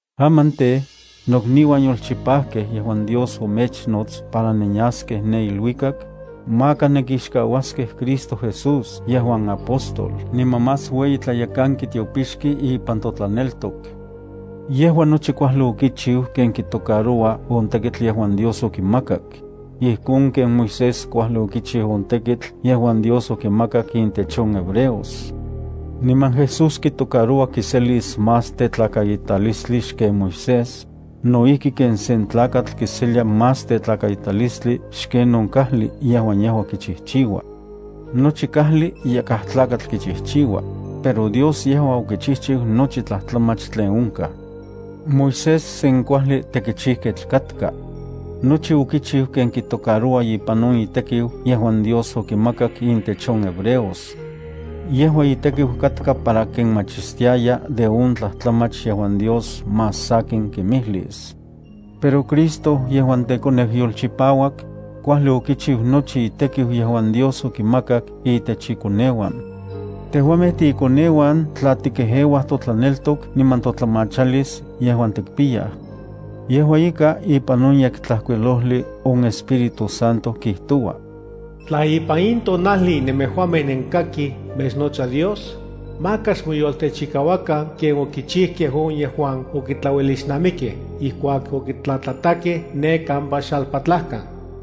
Aman tej, nokniuan yolchopijkej yejuan Dios omechnots para nenyaskej ne iluikak, maka nenkixkauaskej Cristo Jesús yejuan apóstol niman más ueyi tlayekanki tiopixki ipan totlaneltok. Yejua nochi kuajli okichiu ken kitocaroua on tekitl yejuan Dios okimakak, ijkon ken Moisés kuajli okichiu on tekitl yejuan Dios okimakak intech on hebreos. Niman Jesús kitocaroua kiselis más tetlakaitalistli xken Moisés, no ijki ken sen tlakatl kiselia más tetlakaitalistli xken on kajli yejuan yejua kichijchiua. Nochi kajli yakaj tlakatl kichijchiua, pero Dios yejua okichijchiu nochi tlajtlamach tlen onkaj. Moisés sen kuajli tekichijketl katka. Nochi okichiu ken kitocaroua ipan on itekiu yejuan Dios okimakak intech on hebreos. Yejua itekiu katka para kinmachistiaya de on tlajtlamach yejuan Dios más sakin kimijlis. Pero Cristo yejuan yolchipauak tekoneu, kuajli okichiu nochi itekiu yejuan Dios okimakak intech ikoneuan. Tejuamej tiikoneuan tla tikejeuaj totlaneltok niman totlamachalis yejuan tikpiyaj. Yejua ika, ipan on Yektlajkuilojli on Espíritu Santo kijtoua: Tla ipan in tonajli nemejuamej nenkakij mechnotsa Dios, maka xmoyoltechikauakan ken okichijkej on yejuan okitlauelixnamikej ijkuak okitlatlatakej ne kampa xalpatlajkan.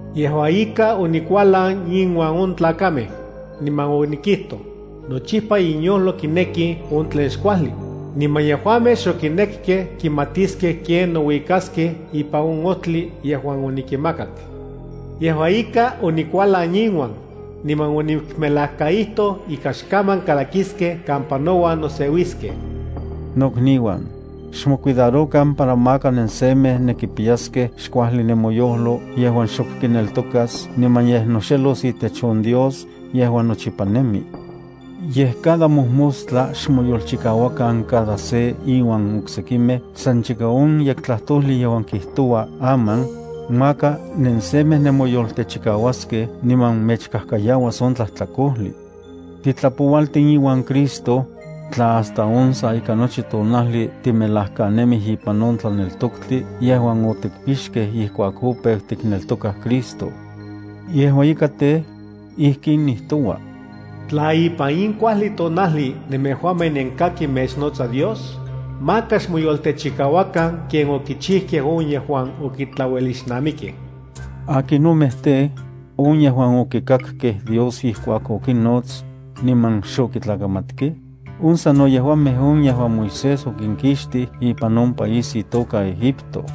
Yejua ika, onikualan inuan on tlakamej, niman onikijtoj: “Nochipa inyojlo kineki on tlen xkuajli, niman yejuamej xokinekkej kimatiskej ken nouikaskej ipan on ojtli yejuan onikinmakak.” Yejua ika, onikualan inuan, niman onikmelajkaijtoj ika xkaman kalakiskej kampa nouan noseuiskej.” Nokniuan, xmocuidarokan para maka nensemej nenkipiyaskej xkuajli nemoyojlo yejuan xok kineltokas niman yej noxelos itech on Dios yejuan nochipa nemi. Yej cada mojmostla xmoyolchikauakan cada se inuan oksekimej san chika on yektlajtojli kijtoua “Aman”, maka nensemej nemoyoltechikauaskej niman mechkajkayauas on tlajtlakojli. Titlapoualtin iuan Cristo, tla hasta on sa ika nochi tonajli timelajkanemij ipan on tlaneltoktli yejuan otikpixkej ijkuak opeu tikneltokaj Cristo. Yejua ika tej, ijkin nijtoua: Tla ipan in kuajli tonajli nemejuamej nenkakij mechnotsa Dios, maka xmoyoltechikauakan ken okichijkej on yejuan okitlauelixnamikej. ¿Akinomej tej, on yejuan okikakkej Dios ijkuak okinnots, niman xokitlakamatkej? On sano yejuamej on yejuan Moisés okinkixtij ipan on país itoka Egipto.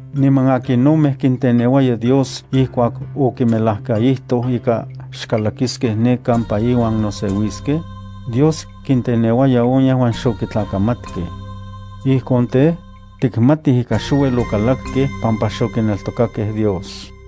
Niman, ¿akinomej kinteneuaya Dios ijkuak okimelajkaijtoj ika xkalakiskej ne kampa iuan noseuiskej? Dios kinteneuaya on yejuan xokitlakamatkej. Ijkon tej, tikmatij ika xouel okalakkej pampa xokineltokakej Dios.